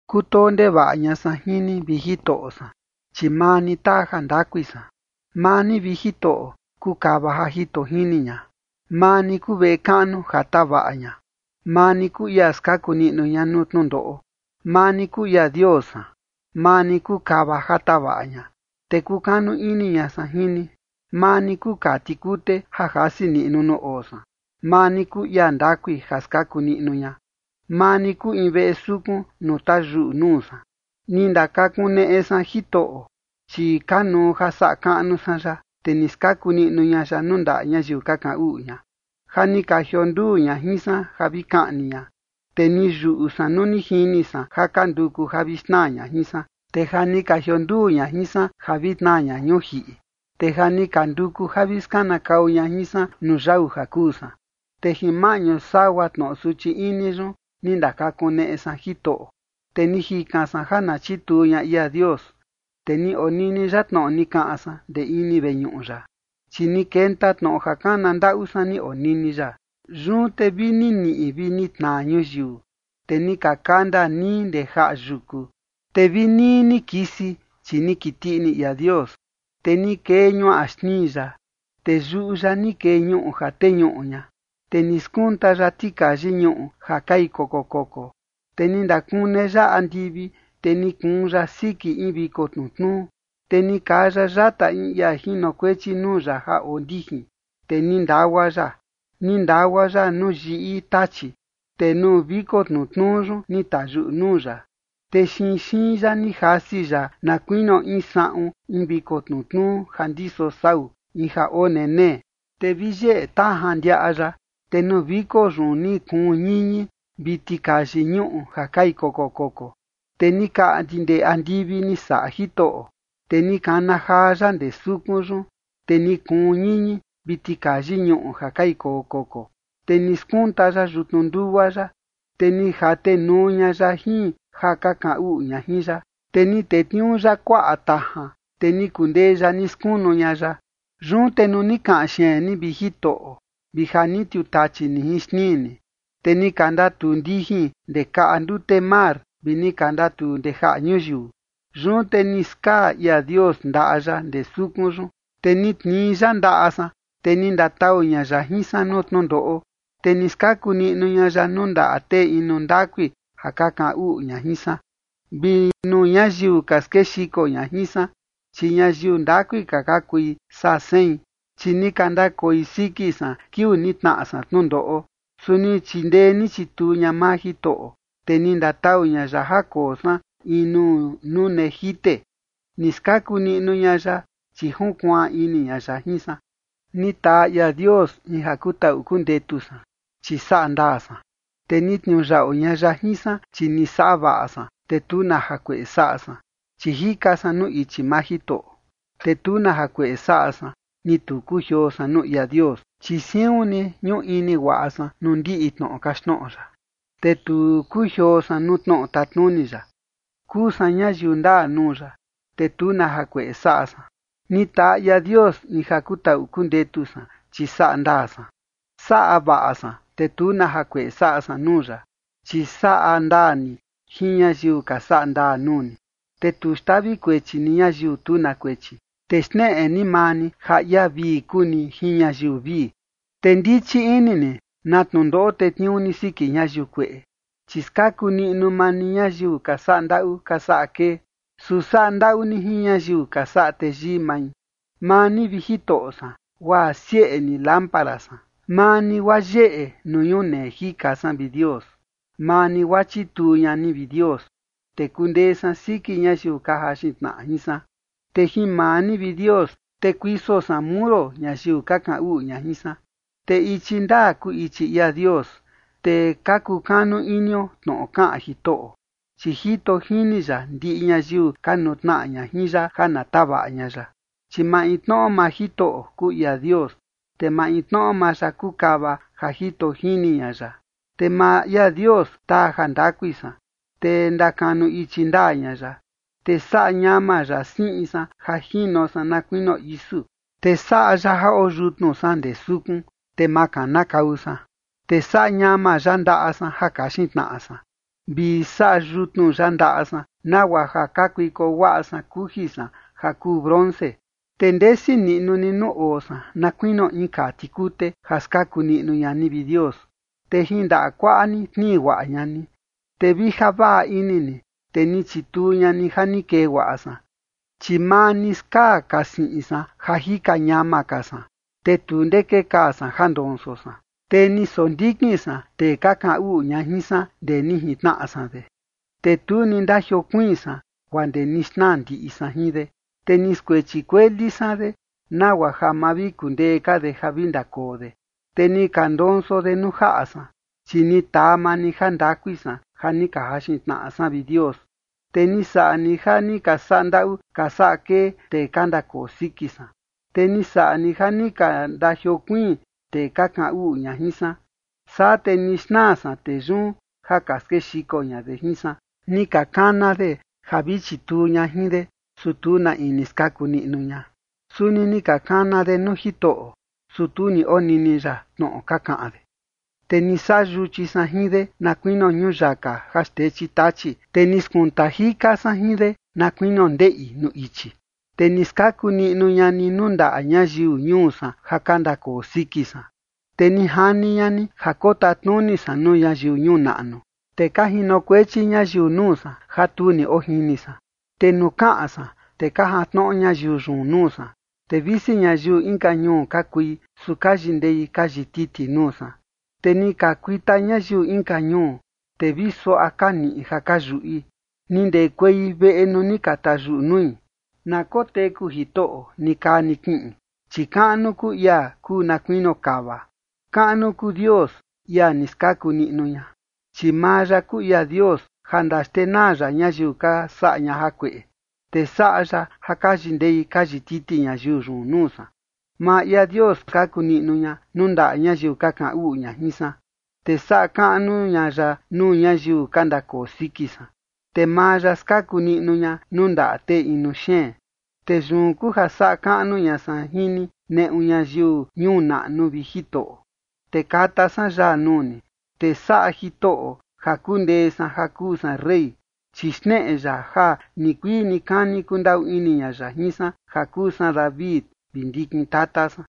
Kutoo ndevaꞌa ña san jin ni, vi Jitoꞌo san, chi maa ni taa jandakui san. Maa ni, vi Jitoꞌo, kuu kava ja jito jini ña. Maa ni kuu veꞌe kaꞌnu ja tavaꞌa ña. Maa ni kuu ia skaku niꞌnu ña nuu tnundoꞌo. Maa ni kuu ia Dios san. Maa ni kuu kava ja tavaꞌa ña, te kukanu ini ña san jin ni. Maa ni kuu kaa tikute ja jasi niꞌnu nuu oo san. Maa ni kuu ia ndakui ja skaku niꞌnu ña. Maa ni kuu in veꞌe sukun nuu tayuꞌu nuu san. Ni ndakakuneꞌe san Jitoꞌo, chi kanuu ja saꞌa kaꞌnu san ya, te ni skaku niꞌnu ña ya nuu ndaꞌa ñayiu ka kaꞌan uꞌu ña. Ja ni ka jionduu ña jin san ja vi kaꞌni ña, te ni yuꞌu san nuu ni jini san ja ka nduku ja vi xnaa ña jin san. Te ja ni ka jionduu ña jin san ja vi tnaa ña ñuu jiꞌi, te ja ni ka nduku ja vi skanakau ña jin san nuu yau ja kuu san. Te jin maꞌñu sagua tnoꞌo suchi ini yun ni ndakakuneꞌe san Jitoꞌo, te ni jikan san ja na chituu ña ia Dios. Te ni onini ya tnoꞌo ni kaꞌan san ndee ini veñuꞌu ya, chi ni kenta tnoꞌo ja kana ndaꞌu san ni onini ya. Yun te vi ni niꞌi vi ni tnaa ñuyiu, te ni ka kanda nii ndee jaꞌa yuku, te vi nii ni kisi, chi ni kiti ini ia Dios. Te ni kee ñuaꞌa xnii ya, te yuꞌu ya ni kee ñuꞌu ja teñuꞌu ña, te ni skunta ya tikayi ñuꞌu ja kai koko koko. Te ni ndakune ya andivi, te ni kuun ya siki in viko tnutnuu. Te ni kaa ya yata in ia jinokuechi nuu ya ja oo ndijin, te ni ndagua ya. Ni ndagua ya nuu yiꞌi tachi. Te nuu viko tnutnuu yun ni tayuꞌu nuu ya, te xinxiin ya ni jasi ya na kuinio in saꞌun in viko tnutnuu ja ndiso sau, in ja oo nenee. Te vi yeꞌe tajan ndiaꞌa ya, te nuu viko yun ni kuun ñiñi vi tikayi ñuꞌu ja kai koko koko. Te ni kaꞌndi ndee andivi ni saꞌa Jitoꞌo, te ni kana jaa ya ndee sukun yun, te ni kuun ñiñi vi tikayi ñuꞌu ja kai koko koko. Te ni skunta ya yutnu ndugua ya, te ni jatenuu ña ya jin ja ka kaꞌan uꞌu ña jin ya, te ni tetniuu ya kuaꞌa tajan, te ni kundee ya ni skunu ña ya. Yun te nuu ni kaꞌan xeen ni, vi Jitoꞌo, vi ja ni tiutachi ni jin xnii ni, te ni ka ndatuu ndijin ndee kaꞌa ndute mar vi ni ka ndatuu ndee jaꞌa ñuyiu. Yun te ni skaa ia Dios ndaꞌa ya ndee sukun yun, te ni tnii ya ndaꞌa san, te ni ndatau ña ya jin san nuu tnundoꞌo. Te ni skaku niꞌnu ña ya nuu ndaꞌa tee inu ndakui ja ka kaꞌan uꞌu ña jin san, vi nuu ñayiu ka skexiko ña jin san, chi ñayiu ndakui ka ni ka okui saa sein. Chi ni ka ndakoi siki san kiuu ni tnaꞌa san tnundoꞌo, su ni chindee ni chituu ña maa Jitoꞌo. Te ni ndatau ña ya ja koo san in nuu nune jite, ni skaku niꞌnu ña ya, chi junkuaan ini ña ya jin san. Ni taa ia Dios in ja kutaꞌu kundetu san, chi saꞌa ndaa san. Te ni tniuyaꞌu ña ya jin san, chi ni saꞌa vaꞌa san, te tu na jakueꞌe saꞌa san. Chi jika san nuu ichi maa Jitoꞌo, te tu na jakueꞌe saꞌa san, ni tu kujioo san nuu ia Dios. Chi siun ni ñuꞌu ini guaꞌa san nuu ndiꞌi tnoꞌo kaxtnoꞌo ya, te tu kujioo san nuu tnoꞌo tatnuni ya. Kuu san ñayiu ndaa nuu ya, te tu na jakueꞌe saꞌa san. Ni taa ia Dios in ja kutaꞌu kundetu san, chi saꞌa ndaa san. Saꞌa vaꞌa san, te tu na jakueꞌe saꞌa san nuu ya. Chi saꞌa ndaa ni jin ñayiu ka saꞌa ndaa nuu ni, te tu xtavi kuechi ni ñayiu tu na kuechi. Te xneꞌe ni maa ni ja ia vii kuu ni jin ñayiu vii, te ndichi ini ni na tnundoꞌo tetniuu ni siki ñayiu kueꞌe. Chi skaku niꞌnu maa ni ñayiu ka saꞌa ndaꞌu ka saꞌa kee, su saꞌa ndaꞌu ni jin ñayiu ka saꞌa teyii mai. Maa ni, vi Jitoꞌo san, guaa sieꞌe ni lámpara san. Maa ni, guaa yeꞌe nuu ñunee jika san, vi Dios. Maa ni, guaa chituu ña ni, vi Dios, te kundee san siki ñayiu ka jaxin tnaꞌa jin san, te jin maa ni, vi Dios, te kuiso san muro ñayiu ka kaꞌan uꞌu ña jin san. Te ichi ndaa kuu ichi ia Dios, te ka kukanu inio tnoꞌo kaꞌan Jitoꞌo, chi jito jini ya ndiꞌi ñayiu ka nutnaꞌa ña jin ya ja na tavaꞌa ña ya. Chi maintnoꞌo maa Jitoꞌo kuu ia Dios, te maintnoꞌo maa ya kuu kava ja jito jini ña ya. Te maa ia Dios taa jandakui san, te ndakanu ichi ndaa ña ya. Te saꞌa ñama ya siꞌi san ja jino san na kuinio isu, te saꞌa ya ja oo yutnu san ndee sukun, te ma kanakau san. Te saꞌa ñama ya ndaꞌa san ja kaxin tnaꞌa san, vi saꞌa yutnu ya ndaꞌa san nagua ja kakuiko guaꞌa san kuji san ja kuu bronce. Te ndesi niꞌnu ni nuu oo san na kuinio in kaa tikute, ja skaku niꞌnu ña ni, vi Dios, te jin ndaꞌa kuaꞌa ni tnii guaꞌa ña ni, te vi ja vaꞌa ini ni, te ni chituu ña ni ja ni kee guaꞌa san. Chi maa ni skaa ka siꞌin san ja jika ñama ka san, te tu ndee kekaa san ja ndonso san. Te ni sondikin san tee ka kaꞌan uꞌu ña jin san ndee ni jintnaꞌa san de, te tu ni ndajiokuiin san guaa ndee ni xnaa ndiꞌi san jin de. Te ni skuechi kueli san de nagua ja ma vi kundee ka de ja vi ndakoo de, te ni ka ndonso de nuu jaꞌa san. Chi ni taa maa ni jandakui san ja ni ka jaxin tnaꞌa san, vi Dios, te ni saꞌa ni ja ni ka saꞌa ndaꞌu ka saꞌa kee tee ka ndakoo siki san. Te ni saꞌa ni ja ni ka ndajiokuiin tee ka kaꞌan uꞌu ña jin san, saa te ni xnaa san tee yun ja ka skexiko ña de jin san. Ni ka kana de ja vi chituu ña jin de, su tu na in ni skaku niꞌnu ña. Suni ni ka kana de nuu Jitoꞌo, su tu ni onini ya tnoꞌo ka kaꞌan de. Te ni saꞌa yuchi san jin de, na kuinio ñuyaka ja xtechi tachi, te ni skunta jika san jin de, na kuinio ndeꞌi nuu ichi. Te ni skaku niꞌnu ña ni nuu ndaꞌa ñayiu ñuu san ja ka ndakoo siki san. Te ni jani ña ni ja kotatnuni san nuu ñayiu ñuu naꞌnu, te ka jinokuechi ñayiu nuu san ja tu ni ojini san. Te nuu kaꞌan san, te ka jantnoꞌo ñayiu yun nuu san. Te visi ñayiu inka ñuu ka kui, su ka yindei ka yititi nuu san. Te ni ka kuita ñayiu inka ñuu, te vi suaꞌa ka niꞌi ja ka yuꞌi, ni ndekuei veꞌe nuu ni ka tayuꞌu nui. Na koteku Jitoꞌo nikaa nikiꞌin, chi kaꞌnu kuu ia kuu na kuinio kava. Kaꞌnu kuu Dios, ia ni skaku niꞌnu ña. Chi maa ya kuu ia Dios ja ndaxtenaa ya ñayiu ni ka saꞌa ña jakueꞌe, te saꞌa ya ja ka yindei ka yititi ñayiu yun nuu san. Maa ia Dios skaku niꞌnu ña nuu ndaꞌa ñayiu ka kaꞌan uꞌu ña jin san, te saꞌa kaꞌnu ña ya nuu ñayiu ka ndakoo siki san. Te maa ya skaku niꞌnu ña nuu ndaꞌa tee inu xeen. Te yun kuu ja saꞌa kaꞌnu ña san jin ni neꞌu ñayiu ñuu naꞌnu, vi Jitoꞌo, te kata san yaa nuu ni. Te saꞌa Jitoꞌo ja kundee san ja kuu san rey, chi xneꞌe ya ja nikuii nikani kundaꞌu ini ña ya jin san ja kuu san David, vi ndikin tata san.